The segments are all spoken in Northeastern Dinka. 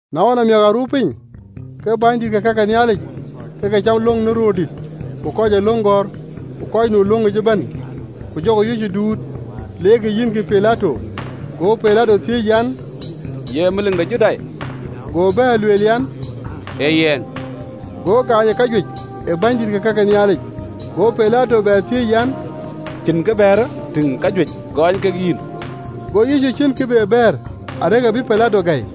Na ɣɔn amiäk, aa ruu piny, ke bänydït ke ka ke Nhialic ke ke cam löŋ në röördït ku kɔc ee löŋ gɔ̈ɔ̈r ku kɔc nu ë löŋic ëbɛ̈n, ku jɔkï Yecu duut, leerkï yïnkï Pilato. Go Pilato thiëëc, an, “Ye melik de Judai?” Go bɛ̈ɛ̈r, lueel an, “Ee yɛn.” Go gaany ë kajuëc ë bänydït ke ka ke Nhialic. Go Pilato thiëëc an, “Cïn kë bɛ̈ɛ̈r? Tïŋ kajuëc gɛɛny kek yïn.” Go Yecu ciën kë be bɛ̈ɛ̈r: arëk abï Pilato gäi.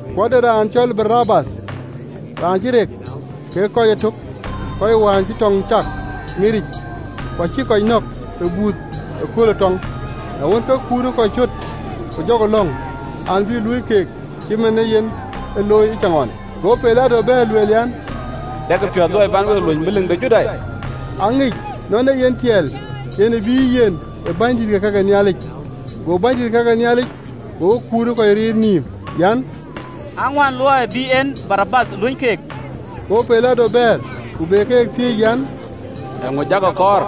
Ku ade raan cɔl Barabath, raan cï rek kekë kɔc ëtök kɔc wään cï tɔŋ cäk miric, ku acïk kɔc nɔ̈k ë buuth ëkööl ë tɔŋ. Na wën, ke kut ë kɔc cöt, ku jɔkï lɔ̈ŋ an, bï luöi keek cït man ee yen e looi ëcaŋɣɔn. Go Pilato bɛ̈ɛ̈r, lueel an, “Dɛkï piɔ̈ɔ̈th luɔi bän week luöny Melik de Judai?” Aŋic ë gɔk nɔn ee yen tiɛɛl yen ë bïïyë yen ë bänydït ke ka ke Nhialic. Go bänydït ke ka ke Nhialic gokï kut ë kɔc riir nïïm an, aŋuän luɔi bï en Barabath luöny keek. Go Pilato bɛ̈ɛ̈r ku be keek thiëc an, “Eeŋö jakï kɔɔr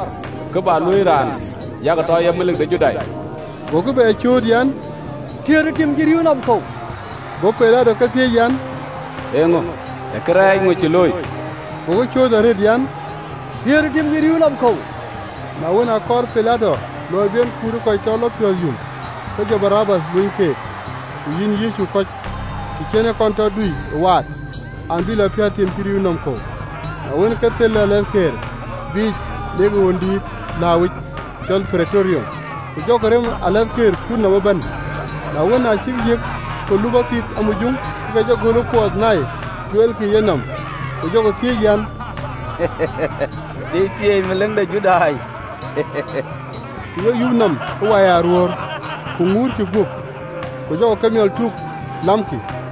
kë bä luöi raan yak tɔ ye Melik de Judai?” Gokï bɛ cööt an, “Piäät ë tim cï rïïu nɔm kɔ̈u!” Go Pilato ke thiëëc an, “Eeŋö, ee kërɛɛc ŋö cï looi?” Gokï cööt arëët an, “Piäätë ë tim cï rïïu nɔm kɔ̈u!” Na wën, akɔɔr Pilato luɔi bï en kut ë kɔc tɔ lɔ piɔ̈ɔ̈th yum, ke jɔ Barabath luöny keek. Go Yecu kɔn tɔ dui ë waat, ku yïn kɔc bï lɔ piäät ë tim cï rïïu nɔm kɔ̈u. Na wën, ke thel alathkëër biic leerkï alooc dïït lääuwic: ku jɔkï rem alathkëër kut nɔm ëbɛ̈n. Na wën, aa cïk yiëk kɔ̈u lupɔ thith amujuŋ, ke ke jɔ göl ë kuɔɔth nai, tueelkï ë yenɔm, Ku jɔkï thiëëc an, “Thieithieei, Melik de Judai!” Ku yek yup nɔm ë wai aruöör, ku ŋuutkï guöp, ku jɔkï kemiɔl tuk, lamkï.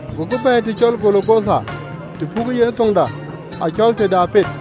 Gokï bɛ̈ɛ̈i të cɔl Golgotha, tɔ pukë yen ë thoŋda, acɔl “Tëde Apet.”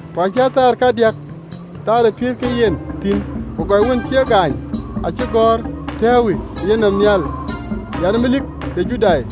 Ku acï aa thaar kadiäk, thaar ë piëët kek yen thïn. Ku gɔny wën cï e gaany acï gɔ̈ɔ̈r tɛ̈ɛ̈uwë ë yenɔm nhial an, “Melik de Judai.”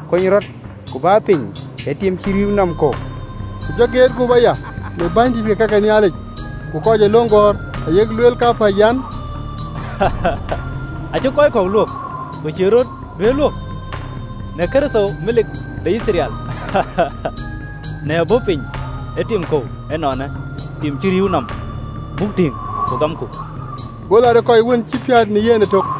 Kony rɔt, ku bä piny ë tim cï rïïu nɔm kɔ̈u.” Ku jɔ geet guöp aya në bänydït ke ka ke Nhialic ku kɔc ee löŋ gɔ̈ɔ̈r, ayek lueel kapäc an, “Acï kɔc kɔ̈k luök, ku acïï rɔt duëër luök. Në Kërtho, Melik de Yithriɛl, në bɔ̈ piny ë tim kɔ̈u ënɔɔnë, tim cï rïïu nɔ̈m, buk tïŋ, ku gamku!” Go lat ë kɔc wën cï piäät në yen ëtök.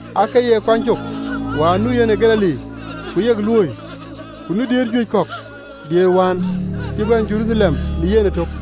Aake ye yen kuany cök wään nu yen ë Galili, ku yek luööi, ku nu diëër juëc kɔ̈k diëër wään cï bɛ̈n Jeruthalem në yen ëtök.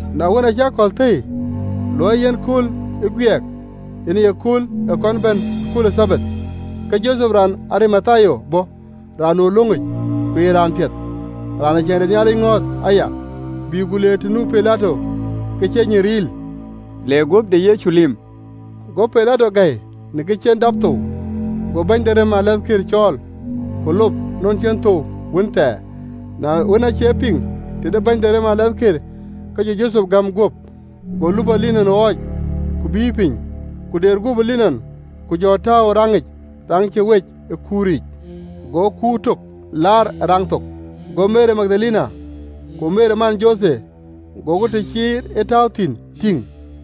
Na wën, aacï akɔ̈l thëi, luɔi ee yen akööl ë Guiɛɛk, yen aye kööl ee kɔn bɛ̈n ë kööl ë Thabath, ke Jothep raan ë Arimathia bɔ̈, raan nu ë löŋic, ku ye raan piɛth, raan ee Ciɛɛŋ de Nhialic ŋɔ̈ɔ̈th aya, bï ku le të nu Pilato ke cï enyin riil, le guöp de Yecu lip. Go Pilato gäi në kë cï en dap thou: go bɛ̈ny de rem ë alathkëër cɔɔl, ku lop nɔn cï en thou wën thɛɛr. Na wën, aacï e piŋ tëde bɛ̈ny de rem ë alathkëër, ke jɔ Jothep gäm guöp. Go lupɔ linɔn ɣɔɔc, ku bïï piny, ku deer guöp ë linɔn, ku jɔ tääu ë raŋic raŋ cï wec ë kuur lɔ giliu yic, go kuur tök laar ë raŋ thok. Go Meri Magdalene ku Meri man Jothe gokï të cï e tääu thïn tïŋ.